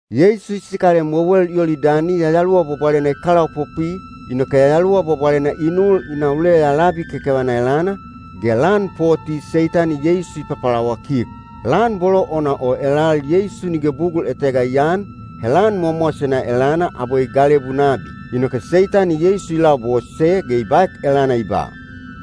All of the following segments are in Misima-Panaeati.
Yeisu i sikalem wewel Yolidani Yayaluwa Bwabwalena i kalaopopwi, inoke Yayaluwa Bwabwalena i nul i na uleya labi kekevana elana, ge lan poti Seitani Yeisu i papalawakik. Lan bolo ona o elal Yeisu nige bugul etega i aan, he lan mowamowasena elana abwe i galebu nabi. Inoke Seitani Yeisu i labose ge i baek elana i ba,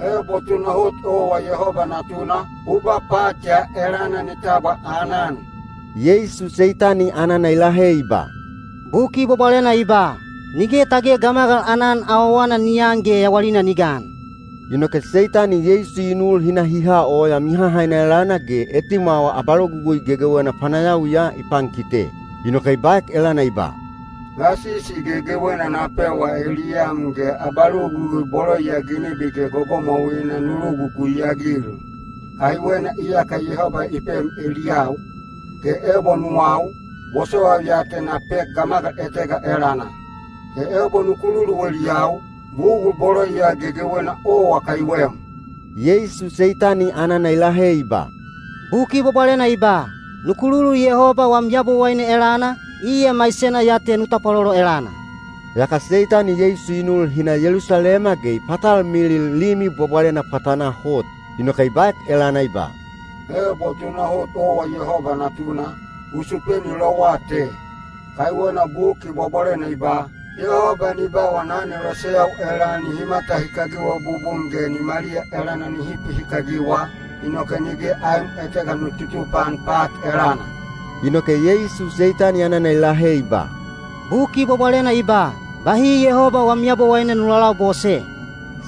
“Ebo tunahot owa Yehoba Natuna, u ba pat ya elana ni tabwa aanan.” Yeisu Seitani anana i lahe i ba, “Buki Bwabwalena i ba, ‘Nige tage gamagal aanan awawana ni an ge yawalina ni gan.’” Inoke Seitani Yeisu i nul hi na hi ha oya mihahaina elana ge etimwawa abalogugui gegewena panayawiya i pankite. Inoke i baek elana i ba, “Gasisi gegewena na pewa eliyam ge abalogugui bolo ya ginebi ge gogomwauina nu logugui-agil. Kaiwena iyaka Yehoba i pem eliyau, ge ebo nuwau, bosowaiu ya te na pek gamagal etega elana. He ebo nu kululu eliyau, bugul bolo ya gegewena owa kaiwem.” Yeisu Seitani anana i lahe i ba, “Buki Bwabwalena i ba, ‘Nu kululu Yehoba wam Yabowaine elana, iya maisena ya te nu tapwalolo elana.’” Yaka Seitani Yeisu i nul hi na Yelusalema ge i patalmilil Limi Bwabwalena pwatanaa hot. Inoke i baek elana i ba, “Ebo tunahot owa Yehoba Natuna, u supeni lowa te. Kaiwena Buki Bwabwalena i ba: Yehoba ni ba wana aneloseyau elal nihi matahikagiwa bubun ge nimaliya elana nihi pihikagiwa, inoke nige aem etega nu tutupaan pat elana.” Inoke Yeisu Seitani anana i lahe i ba, “Buki Bwabwalena i ba, ‘Bahi Yehoba wam Yabowaine nu lalabose.’”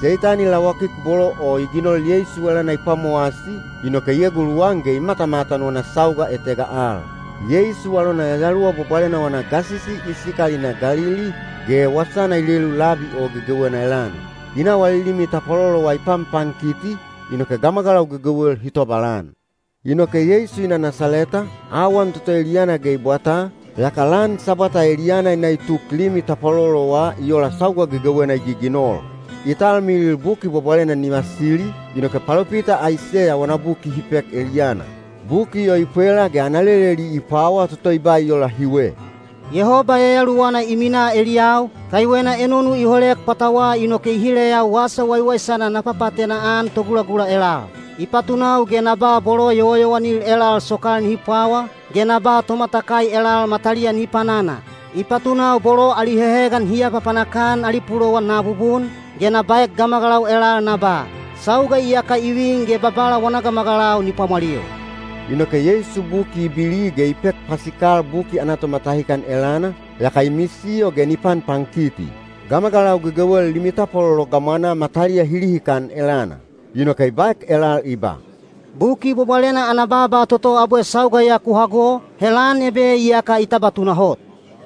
Seitani lawakik bolo o i ginol Yeisu elana i pwamowasi, inoke i eguluwan ge i matamatan wana sauga etega al. Yeisu alona Yayaluwa Bwabwalena wana gasisi i sikal i na Galili, ge wasana i lelu labi o gegewena elana. I na wali limi tapwalolowa i panpankiti, inoke gamagalau gegewel hi tobalan. Inoke Yeisu i na Nasaleta, awan toto eliyana ge i bwataa, yaka lan Sabwata eliyana i na i tuk limi tapwalolowa i ola sauga gegewena i giginol. I talmilil Buki Bwabwalena ni vasili, inoke palopita Aiseya wana buki hi pek eliyana. Buki o i pwela ge ana leleli i pwawa toto i ba i ola hiwe: Yehoba Yayaluwana i minaa eliyau, kaiwena enonu i holek pwatawa inoke i hileyau wasa waiwaisana na papaatena-an togulagula elal. I patunau ge na ba bolo yowayowanil elal sokal nihi pwawa, ge na ba tomatakai elal mataliya nihi panana. I patunau bolo ali hehegan hi apapanak-an ali pulowan na abubun, ge na baek gamagalau elal na ba, “Sauga iyaka i vin ge Babala wana gamagalau ni pwamwalil.” Inoke Yeisu buki i bili ge i pek pasikal buki ana tomatahikan elana, yaka i misiyo ge ni panpankiti. Gamagalau gegewel limi tapwalolo gamwanaa mataliya hi lihikan elana. Inoke i baek elal i ba, “Buki Bwabwalena ana baaba toto abwe sauga ya ku hago, he lan ebe iyaka i tabwa tunahot.”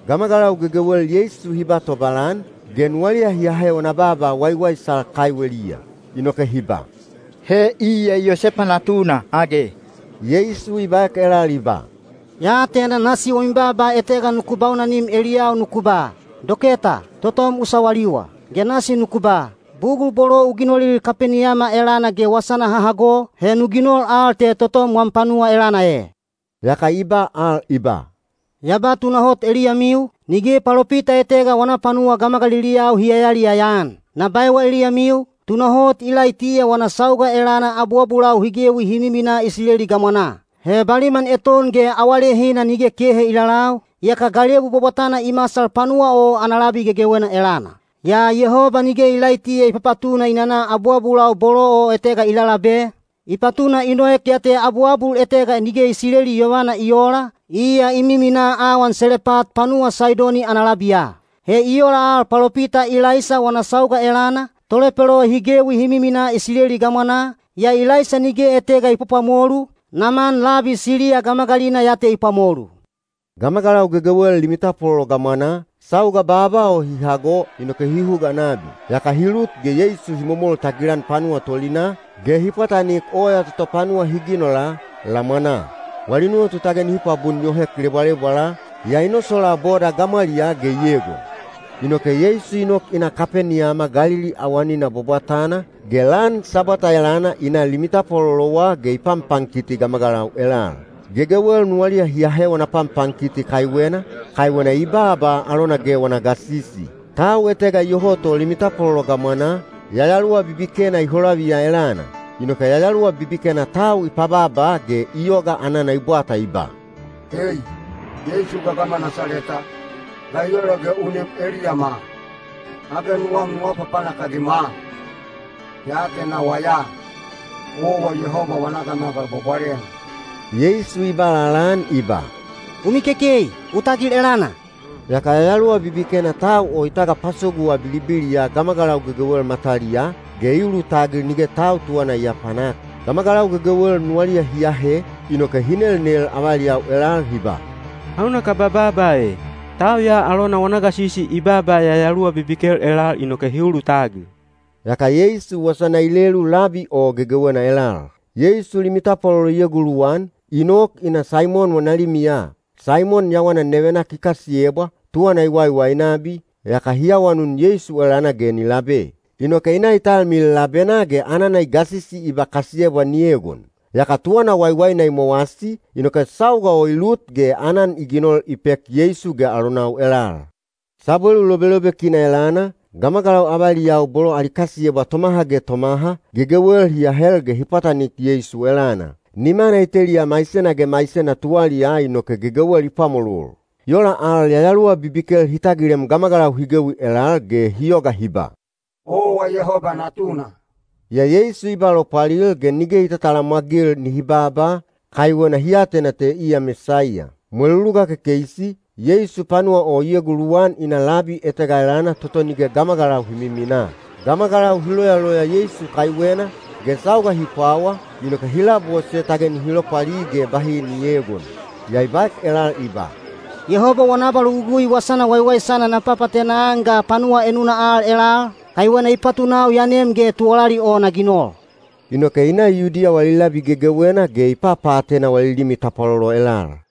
Gamagalau gegewel Yeisu hi ba tobalan, ge nuwaliya hi ahe wana baaba waiwaisal kaiweliya. Inoke hi ba, “He iya Yosepa natuna age?” Yeisu i baek elal i ba, “Ya atena nasi wami baaba etega nuku baunanim eliyau nuku ba, ‘Doketa, totom u sawaliwa.’ Ge nasi nuku ba, ‘Bugul bolo u ginolil Kapeniyama elana ge wasana ha hago, he nu ginol al te totom wam panuwa elana e.’” Yaka i ba al i ba, “Ya ba tunahot eliyamiu, nige palopita etega wana panuwa gamagaliliyau hi yayaliyaya-an. Na baewa eliyamiu, tunahot Ilaitiya wana sauga elana abuabulau hi gewi hi miminaa Isileli gamwanaa. He baliman eton ge awalehina nige kehe i lalau, yaka galebu bwabwatana i masal panuwa o ana labi gegewena elana. Yaa Yehoba nige Ilaitiya i papatuna i nana abuabulau bolo o etega i lalabe, i patuna i noek ya te abuabul etega nige Isileli yovana i oola, iya i miminaa awan Selepat panuwa Saidoni ana labiya. He i ola al palopita Ilaisa wana sauga elana, tolepelo hi gewi hi miminaa Isileli gamwanaa, yaa Ilaisa nige etega i pwapwamolu, Naman labi Siliya gamagalina ya te i pwamolu.” Gamagalau gegewel limi tapwalolo gamwanaa, sauga baaba o hi hago inoke hi huga nabi. Yaka hi lut ge Yeisu hi momol tagilan panuwa tolinaa, ge hi pwatanik oya toto panuwa hi ginola, lamwanaa. Wali nuwatu tage nihi pwabun yohek lebwalebwala, yaa i nosolaa boda gamwaliyaa ge i egon. Inoke Yeisu i nok i na Kapeniyama Galili awanina bwabwatana, ge lan Sabwata elana i na limi tapwalolowa ge i panpankiti gamagalau elal. Gegewel nuwaliya hi ahe wana panpankiti kaiwena, kaiwena i baaba alona ge wana gasisi. Tau etega iyoho to limi tapwalolo gamwanaa, yayaluwa bibikena i holaviya elana. Inoke yayaluwa bibikena tau i pabaaba ge i yoga anana i bwata i ba, “Ei! Yeisu gagama Nasaleta, ga i ola ge u nem eliyama? Age nuwam nu apapanak-agima? Ya atenawa ya, owa Yehoba wana Gamagal Bwabwalena.” Yeisu i ba lalaan i ba, “U mikekei! U tagil elana!” Yaka yayaluwa bibikena tau o i tagapasoguwa bilibiliya gamagalau gegewel mataliyaa, ge i ulutagil nige tau tuwana i aapanak. Gamagalau gegewel nuwaliya hi ahe, inoke hi nelnel avaliyau elal hi ba, “Hauna kaba baaba e? Tau ya alona wana gasisi i baaba yayaluwa bibikel elal inoke hi ulutagil.” Yaka Yeisu wasana i lelu labi o gegewena elal. Yeisu limi tapwalolo i eguluwan, i nok i na Saimon wana limiya. Saimon yawana nevenak i kasiyebwa, tuwana i waiwai nabi, yaka hi awanun Yeisu elana ge ni labe. Inoke i na i talmilil labenaa ge anana i gasisi i ba kasiyebwa ni egon. Yaka tuwana waiwaina i mowasi, inoke sauga o i lut ge aanan i ginol i pek Yeisu ge alonau elal. Sabwelu lobelobekina elana, gamagalau avaliyau bolo ali kasiyebwa tomaha ge tomaha, gegewel hi ahel ge hi pwatanik Yeisu elana. Nimana i teliya maisena ge maisena tuwaliyaa inoke gegewel i pwamolol. I ola al yayaluwa bibikel hi tagilem gamagalau hi gewi elal ge hi yoga hi ba, “Owa Yehoba Natuna.” Yaa Yeisu i ba lopwalil ge nige i tatalamwagil nihi baaba, kaiwena hi atena te iya Mesaiya. Mweluluga kekeisi, Yeisu panuwa o i eguluwan i na labi etega elana toto nige gamagalau hi miminaa. Gamagalau hi loyaloya Yeisu kaiwena, ge sauga hi pwawa, inoke hi labose tage nihi lopwali ge bahi ni eegon. Yaa i baek elal i ba, “Yehoba wana abalogugui wasana waiwaisana na papaatena-an ga panuwa enuna al elal, kaiwena i patunau ya nem ge tuwalali o na ginol.” Inoke i na Yudiya wali labi gegewena ge i papaatena wali limi tapwalolo elal.